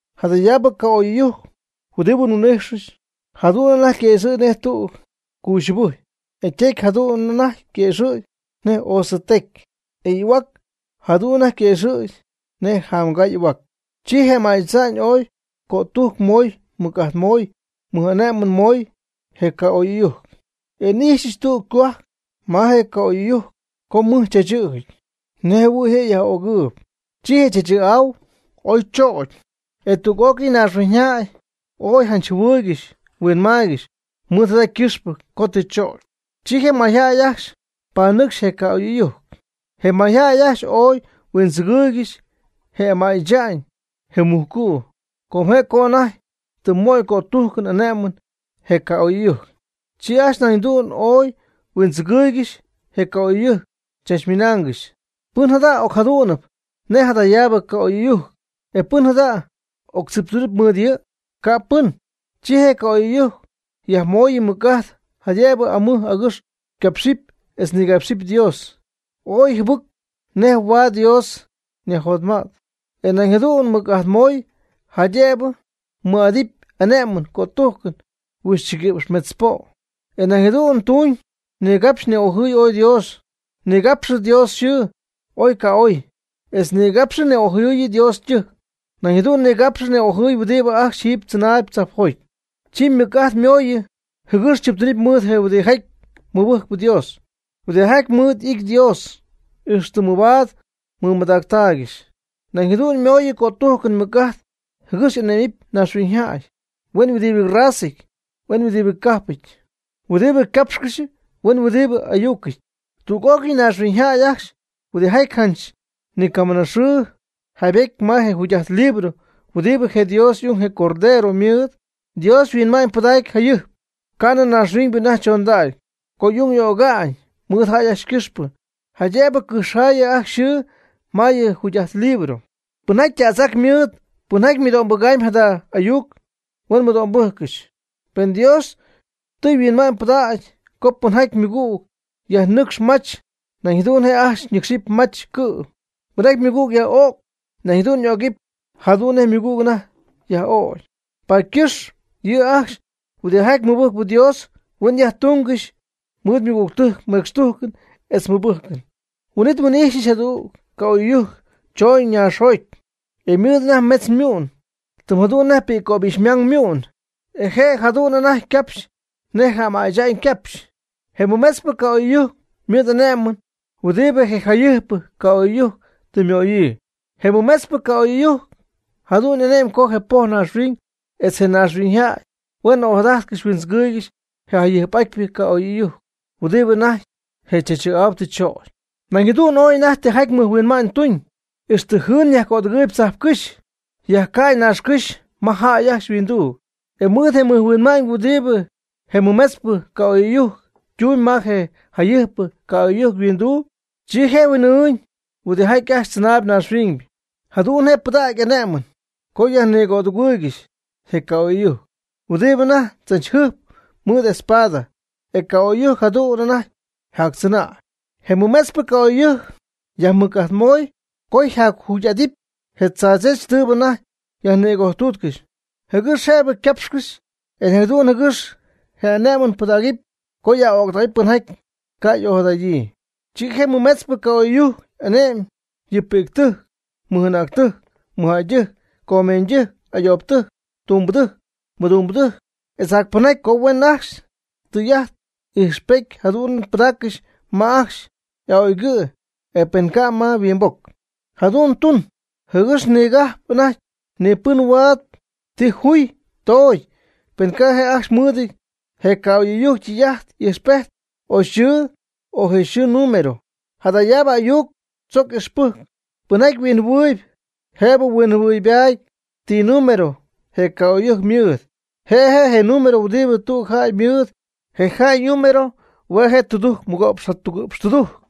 Jadayaabɨ ca'oy'ɨyujc huɨdibɨ nhuin'ijxɨch, jadu'n anajty yquëxɨ̈gy nej tüg cuuxyubɨjy. E ytecy jadu'n anajty yquëxɨ̈gy nej osɨ ytecy, e y'ahuac jadu'n anajty yquëxɨ̈gy nej jamgaa y'ahuac. Chi je ama'y tza'ñ oy cötujc möy, mɨc'ajt möy, mɨj'ane'mɨn möy, je ca'oy'ɨyujc. E n'ijxyɨch tüg ycohuajc ma je ca'oy'ɨyujc co mɨj chaachɨ̈jɨty, nej jɨhuɨ̈y je' yaj'ögɨɨb. Chi je chaachɨ̈'au oy choogy, e tüg'ócɨy naaxhuiñyjäy ooy janch jɨhuɨɨygɨxy huinmaaygɨxy mɨɨd jada ycɨxpɨ co tɨ choocy. Chi je mayjäy ajcxy panɨcxy je ca'oy'ɨyujc. Je mayjäy ajcxy ooy huindzɨgɨɨygɨxy je ama'y tza'ñ, je mujcu', com je' co anajty tɨ möy cötujcɨn ane'mɨn je ca'oy'ɨyujc. Chi ajcxy nañ jadu'n ooy huindzɨgɨɨygɨxy je ca'oy'ɨyujc, chachmɨnaangɨxy: ―¿Pɨn jada' ocjadu'nɨp nej jadayaabɨ ca'oy'ɨyujc, e pɨn jada' octziptuunɨp mɨɨd yɨ'? Ca' pɨn. Chi je ca'oy'ɨyujc yajmooyɨ mɨc'ajt, jaydëbɨ amɨj agɨx capxɨp etz nigapxɨp Dios oy jɨbɨc, nej huaad Dios yajjotmäty. E nañ jadu'n mɨc'ajt moy, jaydëbɨ mɨɨd'adɨpy ane'mɨn cötujcɨn huixchɨguïpx metz po'. E jadu'n je' tuuñ. Nigapxy ni'ojɨɨy ooy Dios. Nigapxɨ Dios yxɨɨ oy ca'oy, etz nigapxɨ ni'ojɨɨyɨ Dios ytɨjc. Nañ jadu'n nigapxy ni'ojɨɨy huɨdibɨ ajcxy jiiby tzɨnaayb tzajpjoty. Chi mɨc'ajt ymooyɨ, jɨgɨx chiptuunɨp mɨɨd je huɨdijaty mɨbɨjcp Dios, huɨdijaty mɨɨd ity Dios, ixtɨ mɨbaad mɨmadaaccɨxy. Nañ jadu'n mooyɨ cötujcɨn mɨc'ajt, jɨgɨx ane'mɨp naaxhuiñyjäy huen huɨdibɨ razaɨty huen huɨdibɨ cajpɨty, huɨdibɨ capxcɨxp huen huɨdibɨ ayucɨty. Tüg'ócɨy mayñaaxhuiñyjäy ajcxy huɨdijaty janch ni ycamiiñ yxɨɨ jaybety ma je jugy'ajt libro huɨdibɨ je Dios y'ung, je Cordero, ymɨɨd. Dios yhuinma'ñypɨdacy jayɨjp ca'nɨ naaxhuiñybɨ anajty chondägy co y'ung y'öga'ñ mɨɨd jäy ajcxy ycɨxpɨ, jaydëbɨ cɨjxjaayɨ ajcxy yxɨɨ ma yɨ jugy'ajt libro. Pɨnjaty tädz'ac mɨɨd, pɨnjaty mɨdo'mbɨgamb jada ayuc, huen mɨdo'mbɨjccɨxy. Pen Dios tɨ yhuinma'ñypɨdägy co pɨnjaty ymɨgüg yajnɨcx mach, nañ jadu'n je' ajcxy nɨcxɨp mach cɨ'm. Pɨnjaty ymɨgüg yaj'öcp nañ jadu'n y'ögɨp jadu'n nej ymɨgüg anajty yaj'ögy. Paady ycɨxp yɨ' ajcxy huɨdijaty mɨbɨjcp Dios, huen yajtungɨxy mɨɨd ymɨgügtɨjc mecxtujcɨn etz mɨbɨjcɨn. Huin'it nhuin'ijxyɨch jadüg ca'oy'ɨyujc chooñ naaxjoty, e ymɨɨd anajty metz ymu'n, tɨm jadu'n nej pi'ccöbixymang ymu'n. E je' jadu'n anajty ycapxy nej je ama'y tza'ñ ycapxy. Je mɨmetzpɨ ca'oy'ɨyujc ymɨɨd ane'mɨn huɨdibɨ je jayɨjpɨ ca'oy'ɨyujc tɨ ymöyii. Je mɨmetzpɨ ca'oy'ɨyujc jadu'n ane'my co je poj naaxhuiñ etz je naaxhuiñyjäy huen ojadajtcɨxy huindzɨgɨɨygɨxy je jayɨjp'atypɨ ca'oy'ɨyujc huɨdibɨ anajty je chaachɨ̈'au tɨ chögy. Nañ jadu'n ooy anajty tijaty mɨjhuinma'ñ tuñ, ixtɨ jɨɨn yajcödɨgɨɨyb tzajpcɨ́xy, yajcäy naaxcɨ́xy ma jäy ajcxy yhuinduu. E mɨɨd je mɨjhuinma'ñ huɨdibɨ je mɨmetzpɨ ca'oy'ɨyujc ytuñ ma je jayɨjpɨ ca'oy'ɨyujc yhuinduu, chi je' huin'ɨɨñ huɨdijaty ajcxy tzɨnaayb naaxhuiñ. Nañ jadu'n je' pɨdacy y'ane'mɨn co yajnïgojtúutcɨxɨpy je ca'oy'ɨyujc huɨdibɨ anajty tzachɨ̈jɨp mɨɨd espada, e ca' y'ögy, jadu'n anajty jactzɨnäy. Je mɨmetzpɨ ca'oy'ɨyujc yajmɨc'ajtmoy co yajjugy'adɨp je tzaadzech tɨɨbɨ anajty yajnïgojtuutcɨxy, jɨgɨx je' ycapxɨpy etz nañ jadu'n jɨgɨx je' ane'mɨn pɨdägɨpy co yaj'öctähuɨpy pɨnjaty ca' y'ojadadyii. Chi je mɨmetzpɨ ca'oy'ɨyujc ane'my yɨ pi'ctɨjc, mɨj'anäctɨjc, mɨjjäydɨjc, comeeñydɨjc, ayoobɨtɨjc, tumbɨdɨjc, mɨdumbɨdɨjc etz jac pɨnjaty co huen ajcxy tɨy'ajt ijxpejt jadu'n pɨdaaccɨxy ma ajcxy y'a'oygɨ', o pen ca', ma yhuimboc. Jadu'n ytuñ jɨgɨx ni ca'p anajty pɨn huaad ti juy toogy, pen ca' je' ajcxy ymɨɨd je ca'oy'ɨyujc tɨy'ajt y'ijxpejt, o yxɨɨ, o je' yxɨɨ ñinúmero. Jadayaabɨ ayuc chojcpy ixpɨjcɨn, pɨnjaty huinjɨhuɨɨyb jëbɨ mɨhuinma'ñybaady ti número je ca'oy'ɨyujc mɨɨd. Je' je' je número huɨdibɨ tüg jäy mɨɨdɨty. Je jäy ñinúmero hue' je' tudujc mɨgo'px jatugɨ̈px tudujc.